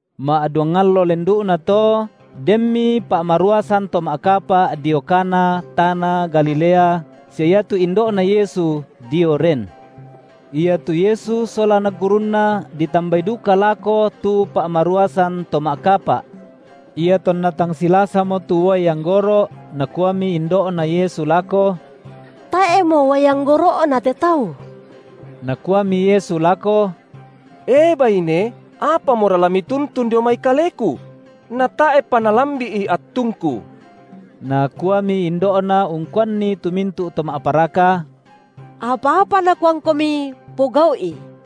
Ma’duang allo lendu’nato, denmi pa’maruasan to ma’kapa’ dio Kana, tana Galilea, sia iatu indo’Na Yesu dio ren. Iatu Yesu sola anak gurunNa ditambai duka lako tu pa’maruasan to ma’kapa’. Iatonna tang silasamo tu uai anggoro’, nakuami indo’Na Yesu lako: Tae’mo uai anggoro’na te tau. Nakuami Yesu lako: E baine, apamora la mituntun dio mai Kaleku? natae’pa nalambi’i attungKu. Nakuami indo’Na ungkuanni tu mintu’ to ma’paraka: Apa-apa Nakuangkomi, pogau’i.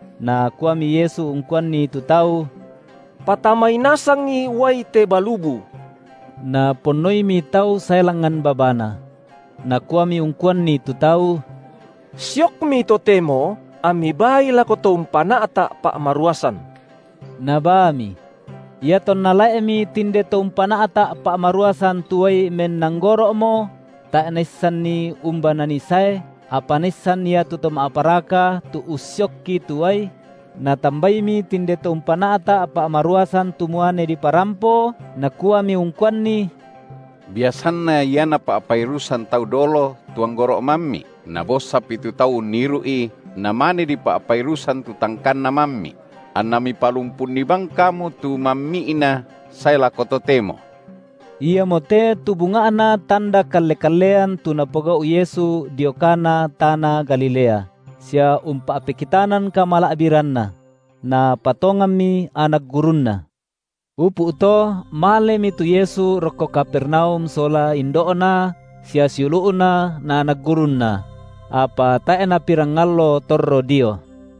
Nakuami Yesu ungkuanni tu tau: Patamai nasangi uai te balubu. Naponnoimi tau sae langngan babana. Nakuami ungkuanni tu tau: Siokmi totemo, ammi baai lako to umpana’ta’ pa’maruasan. Nabaami. Iatonna lae’mi tinde to umpana’ta’ pa’maruasan tu uai menanggoro’mo, – tae’ naissanni umba nanii sae, apa naissan ia tu to ma’paraka, tu ussiokki tu uai – natambaimi tinde to umpana’ta’ pa’maruasan tu muane diparampo, nakuami ungkuanni: Biasanna ia napa’pairusan tau dolo tu anggoro’ mammi’, nabossapi tu tau unniru’i, namane dipa’pairusan tu tangkanna mammi’; anna mipalumpunni bang kamu tu mammi’na sae lako totemo. Iamo te tu bunga’na tanda kalle-kallean tu Napogau’ Yesu dio Kana tana Galilea, sia umpa’pekitanan kamala’biranNa; napatonganmi anak gurunNa. Upu’ to malemi tu Yesu rokko Kapernaum sola indo’Na sia siulu’Na na anak gurunNa; apa tae’ napirang allo torro dio.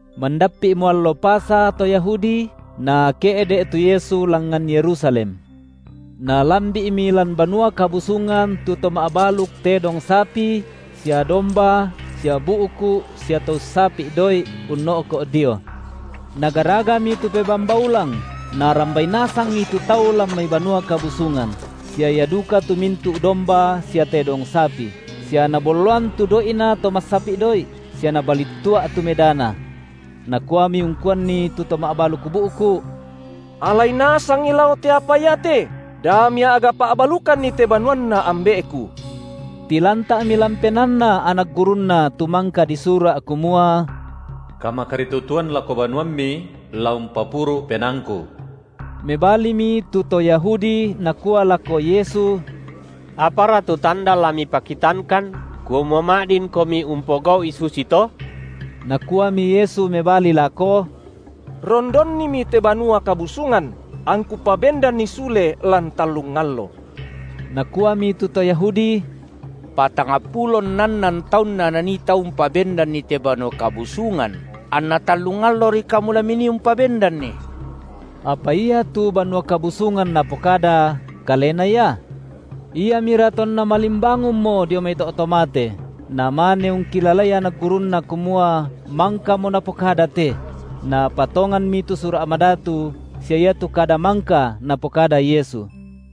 Mandappi’mo allo Pasa to Yahudi, Nake’de’ tu Yesu langngan Yerusalem. Nalambi’mi lan Banua Kabusungan tu to ma’baluk tedong sapi sia domba sia bu’ku’ sia to ussapi’ doi’, unno’ko’ dio. Nagaragami tu pebamba ulang, Narambai nasangi tu tau lan mai Banua Kabusungan, sia ia duka tu mintu’ domba sia tedong sapi; sia Nabolloan tu doi’na to massapi’ doi’, sia Nabalittua’ tu medana. Nakuami ungkuanni tu to ma’baluk bu’ku’: Alai nasangi lao te apa iate, da mia’ga pa’balukanni te banuanNa Ambe’ku. Tilanta’mi lan penaanna anak gurunNa tu mangka disura’ kumua: Kamakaritutuan lako banuamMi la umpapuru’ penaangKu. Mebalimi tu to Yahudi nakua lako Yesu: Apara tu tanda la Mipakitangkan, kumua ma’dinKomi umpogau’i susito? Nakuami Yesu mebali lako: Rondonnimi te Banua Kabusungan, angKu pabendanni sule lan tallung allo. Nakuami tu to Yahudi: Patangpulo nnannan taunna nanii tau umpabendanni te Banua Kabusungan, anna tallung allori Kamu la Minii umpabendanni? Apa ia tu Banua Kabusungan Napokada, Kalena Ia. Iamira tonna malimbangunmo dio mai to’ to mate, namane ungkilalai anak gurunNa kumua mangkamo Napokada te; napatonganmi tu Sura’ Madatu sia iatu kada mangka Napokada Yesu.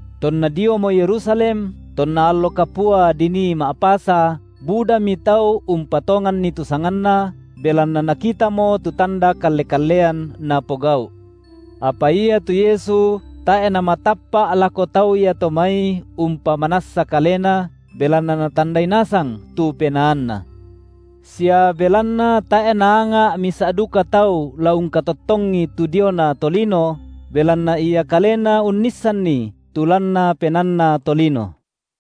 Tonna diomo Yerusalem, tonna allo kapua dinii Ma’pasa, budami tau umpatonganni tu sanganNa, belanna nakitamo tu tanda kalle-kallean Napogau’. Apa iatu Yesu tae’ Namatappa’ lako tau iato mai umpamanassa kalena, belanna Natandai nasang tu penaanna. Sia belanna tae’ Naanga’ misa’ duka tau la ungkatottongi tu diona tolino, belanna Ia kalena unnissanni tu lanna penaanna tolino.